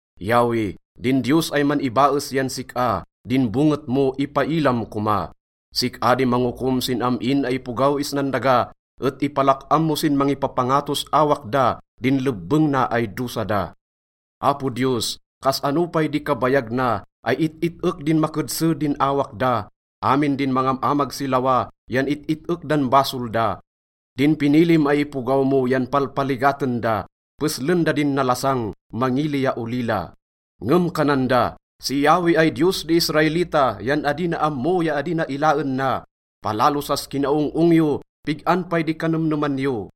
Yahweh, din Diyos ay man-ibaes yan sik-a, din bonget mo ipailam koma. Sik-a di mangokom sin am-in ay ipogaw isnan daga, et ipalak-am mo sin mangipapangatos awak da din lebbeng na ay dosa da. Apo Diyos, kas-ano pay di kabayag na ay it-it-ek din makedse din awak da? Amin din mangam-amag si lawa yan it-it-ek dan basol da. Din pinilim ay ipogaw mo yan palpaligaten da, peslen da din nalasang, mangili ya olila. Ngem kanan da, “Si Yahweh ay Diyos di Israelita yan adi na ammo ya adi na ilaen na.” Palalo sas kinaong-ong yo! Pig-an pay di kanemneman yo?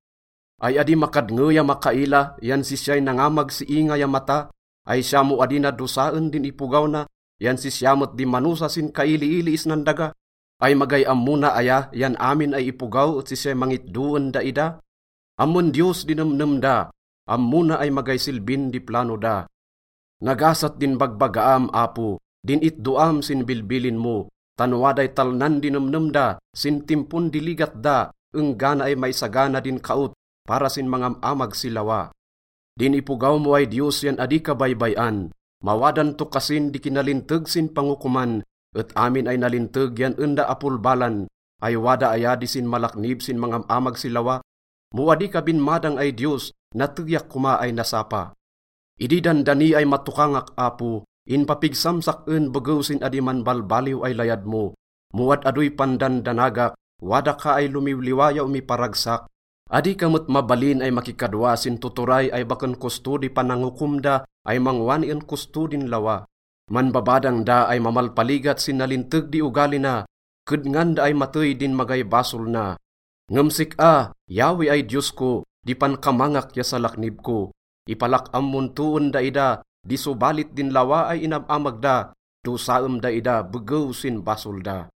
Ay adi makadnge ya makaila yan sisyay nangamag si inga ya mata? Ay siya mo adi na dosaen din ipogaw na yan sisya met di manosa sin kailiili isnan daga? Ay magay ammo na aya yan amin ay ipogaw et sisyay mangitdo en daida? Ammon Diyos di nemnem da, ammo na ay magay silbin di plano da. Nagasat din bagbagaam, Apo, din itdoam sin bilbilin mo, tan waday talnan di nemnem da sin timpon di ligat da enggana ay maisagana din kaot para sin mangam-amag si lawa. Din ipogaw mo ay Diyos yan adi ka baybay-an, mawadan to kasin di kinalinteg sin pangokoman, et amin ay nalinteg yan en da apolbalan. Ay wada aya di sinmalaknib sin mangam-amag si lawa? Mo adi ka binmadang ay Diyos, nateyak koma ay nasapa. Idi dandani ay matokangak, Apo, inpapigsam sak-en begew sin adi manbalbaliw ay layad mo. Mo ad-adoy pandandanagak, wada ka ay lomiwliwa ya omiparagsak. Adi ka met mabalin ay makikadwa sin tuturay ay baken kosto di panangokom da ay mangwani en kosto din lawa. Manbabadang da ay mamalpaligat sin nalinteg di ogali na, kedngan da ay matey din magay basol na. Ngem sik-a, Yahweh ay Diyos ko, di pankamangak ya salaknib ko. Ipalak-am mon to en daida di sobalit din lawa ay inam-amag da, dosaem daida begew sin basol da.